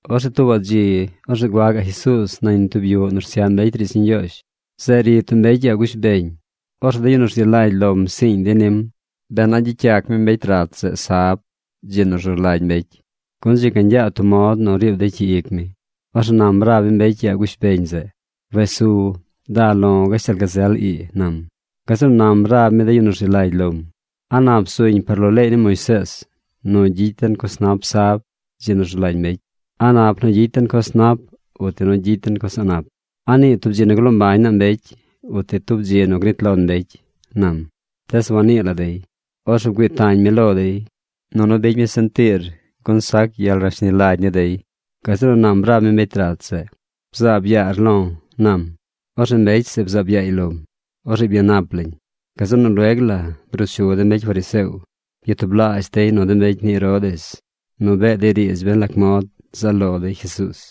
Orzeꞌ tuubaꞌ dzi, orzeꞌ gua gaꞌ Jesuuz nañ tub yuꞌ nu rsyaꞌ mbecy riidz ni Ñgyoozh. Zeꞌ ri tub mbecy yaa gush beñ. Orzeꞌ de yu nu rzi lagy lom psiiñ dey nim ben a gyicy yac mi mbecy rat zeꞌ sab, dzi nu rzu lagy mbecy, gun dzi ga ñgyaad tub mod nu riib dey cyi ic mi. Orzeꞌ nam rab mi mbecy yaa gush beñ zeꞌ: ―Wes su. Da lo̱ gashtal gazel ii ―nam. Gazeꞌ nu nam rab mi de yu nu rzi lagy lom: ―¿A nap zuñ par lo leey ni Moisees nu gyicy den coz nap sab, dzi nu rzu lagy mbecy? ¿A nap nu gyicy den coz nap uti nu gyicy den coz a̱ꞌ nap? ¿A nii tub dzi nu gloo mbañ naa mbecy uti tub dzi nu gnit lon mbecy? ―nam. Tees wannii la dey. Orzeꞌ bgüii tañ mi lo dey, nunu bicy mi sentiir, gun sac gyel rashni lagy ni dey. Gazeꞌ nu nam rab mi mbecy rat zeꞌ: ―Bzaab yaar lo̱ ―nam. Orzeꞌ mbecy zeꞌ bzaab yaay lom. Orzeꞌ byanap lañ. Gazeꞌ nu lueg la bruu chu de mbecy fariseo. Byatublaazh dey nu de mbecy ni Herodes nu bee dey riidz ben lac mod zaꞌ lo dey Jesuuz.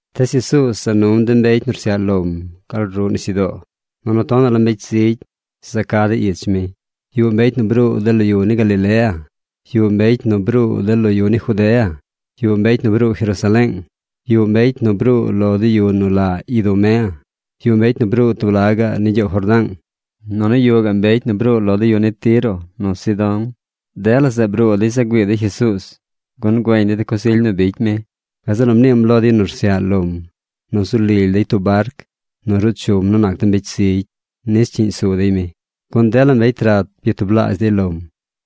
Tees Jesuuz za num de mbecy nu rsyaꞌ lom gal ruꞌ nisyudoo. Nunu tonaꞌ la mbecy zigy za ca dey ich mi. Yuꞌ mbecy nu bruu de lo yu ni Galilea. Yuꞌ mbecy nu bruu de lo yu ni Judea. Yuꞌ mbecy nu bruu Jerusaleeng. Yuꞌ mbecy nu bruu lo de yu nu la Idumea. Yuꞌ mbecy nu bruu tub laꞌ gaꞌ ni gyoow Jordaang. Nunu yuꞌ gaꞌ mbecy nu bruu lo de yu ni Tiro nu Sidón. Dela zeꞌ bruu dey za güii dey Jesuuz gun güeñ dey de coz ily nu bicy mi. Gazeꞌ nu mniim lo de yu nu rsyaꞌ lom nu zu lily dey tub barc nu ruu chum nu nac de mbecy zigy nis cyiꞌñ zu dey mi. Gun dela mbecy rat byatublaazh dey lom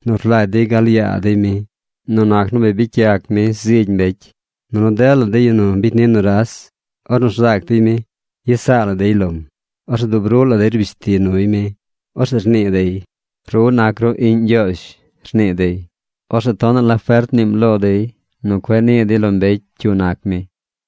nu rlagy dey gal yaa dey mi nu nac nu bi bicy yac mi zigy mbecy. Nunu dela de yu nu bicy ni nuras, ornu rzac dey mi, yes saa la dey lom. Orzeꞌ dub ruꞌ la dey rbish ti nuy mi. Orzeꞌ rnii dey: ―¡Ru nac ru iꞌñ Ñgyoozh! ―rnii dey. Orzeꞌ tonaꞌ la fert mniim lo dey nu cueꞌ nii dey lo mbecy cyu nac mi.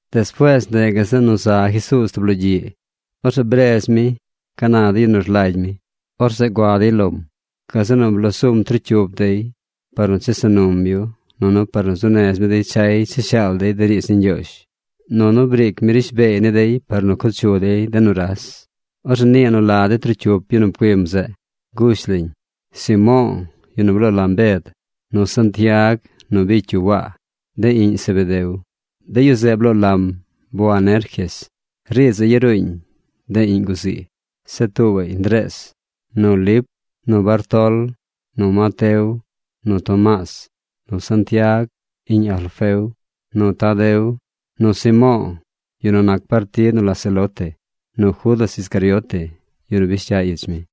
Despuees ndeꞌ gazeꞌ nu za Jesuuz tub logyiꞌ. Orzeꞌ bredz mi ca na de yu nu rlagy mi. Orzeꞌ gua dey lom. Gazeꞌ nu bloo zum trocyup dey par nu chesa num yu nunu par nu zuu nez mi dey chay cha shaal dey de riidz ni Ñgyoozh. Nunu briic mi rishbeey ni dey par nu co chu dey de nuras. Orzeꞌ nii nu la de trocyup yu nu pcuim zeꞌ. Gush lañ: Simo̱o̱, yu nu bloo lam Bed, nu Santiag nu bicy yu Waa, de iꞌñ Zebedeo. De yu zeꞌ bloo lam Boanerges. Riidz zeꞌ yaruuñ: De Iꞌñ guzii. Zeꞌ tuubaꞌy Ndrees, nu Lip, nu Bartol, nu Mateo, nu Tomaas, nu Santiag, iꞌñ Alfeo, nu Tadeo, nu Simo̱o̱, yu nu nac partid nu la Celote, nu Judas Iscariote, yu nu bish cya ich mi.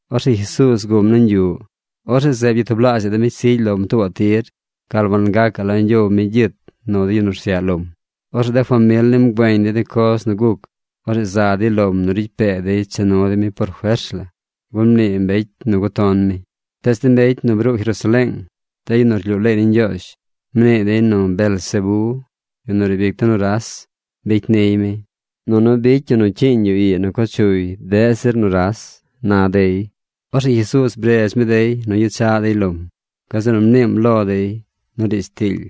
Orzeꞌ Jesuuz guꞌm nañ yuꞌ. Orzeꞌ zeꞌ byatublaazhaꞌ de mbecy zigy lom tuubaꞌ tir gal wangacaꞌ la ñgyow mi gyit nu de yu nu rsyaꞌ lom. Orzeꞌ de famil nim güeñ dey de coz nu guc. Orzeꞌ za dey lom nu ricy pee dey cha nu dey mi por fers la, gun mnii mbecy nu guton mi. Tees de mbecy nu bruu Jerusaleeng, de yu nu rlyuu leey ni Ñgyoozh, mnii dey nu Beelzebé, yu nu riib ic de nuras, bicy niy mi, nunu bicy yu nu cyiiñ yu ii nu co chuy deꞌ zir nuras, na dey. Orzeꞌ Jesuuz bredz mi dey nu gyechaꞌ dey lom. Gazeꞌ nu mniim lo dey nu riidz tiily.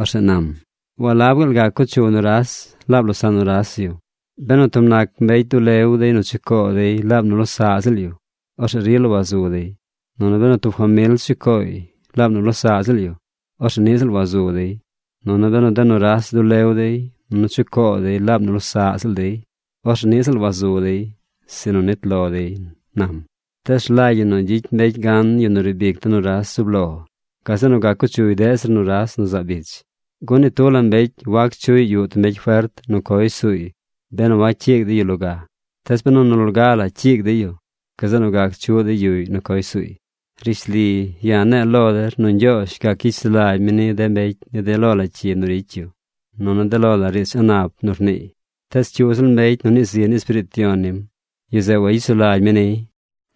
Orzeꞌ nam: ―¿Walab gaal gac co chu nuras laab losaꞌ nuras yu? Benu tub nac mbecy dulew dey nu chucoo dey laab nu losaꞌ ziꞌl yu, orzeꞌ rila wazu dey. Nunu benu tub famil chu cooy laab nu losaꞌ ziꞌl yu, orzeꞌ niꞌ ziꞌl wazu dey. Nunu benu de nuras dulew dey nunu chu coo dey laab nu losaꞌ dey, orzeꞌ niꞌ ziꞌl wazu dey, sinu nit lo dey ―nam―. ’Tees rlagy ñi nu gyicy mbecy gan yu nu riib ic de nuras zub lo. Gazeꞌ nu gac co chuy deꞌ zir nuras nu zaab ich. Gun ni tub la mbecy wac chuꞌy yuꞌ tub mbecy fert nu coy suuy benu wacyiigy dey yu loga. Tees benu nu loga la cyiig dey yu, gazeꞌ nu gac chuꞌ dey yuꞌy nu coy suuy. ’Rishli, ya̱ ne̱e̱ lo der nu Ñgyoozh gac gyicy sulagy mi ni de mbecy ni de lo la cyi nu ricy yu nunu de lo la riidz a̱ꞌ nap nu rniiy, tees cyu ziꞌl mbecy nu nii zi ni Espiriit Yon nim, yu zeꞌ wayicy sulagy mi niy.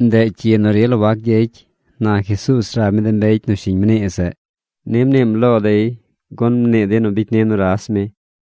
Ndeꞌ cyi nu rila wac gyecy ―na Jesuuz rab mi de mbecy nu shiñ mnii zeꞌ. Ni mniim lo dey gun mnii dey nu bicy ni nuras mi.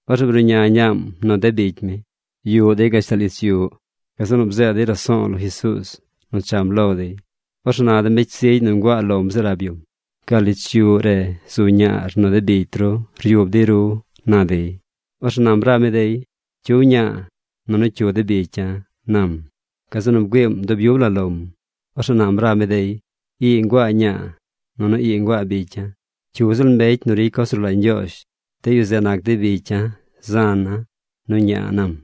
Orzeꞌ bruꞌña ñaam nu de bicy mi. Yuꞌ dey gashtal ich yuꞌ. Gazeꞌ nu bzeed dey raso̱o̱ lo Jesuuz nu cham lo dey. Orzeꞌ na de mbecy zigy nu nguaa lom zeꞌ rab yum: ―Gal ich yuꞌ re zu ñaar nu de bicy ru ryub dey ru ―na dey. Orzeꞌ nam rab mi dey: ―¿Cyu ña̱a̱ nunu cyu de bicya̱? ―nam. Gazeꞌ nu bgüiim dub yub la lom. Orzeꞌ nam rab mi dey: ―Ii nguaa ña̱a̱, nunu ii nguaa bicya̱. Cyu ziꞌl mbecy nu ricy coz nu rlagy Ñgyoozh, de yu zeꞌ nac dey bicya̱, zana̱, nu ña̱a̱ ―nam.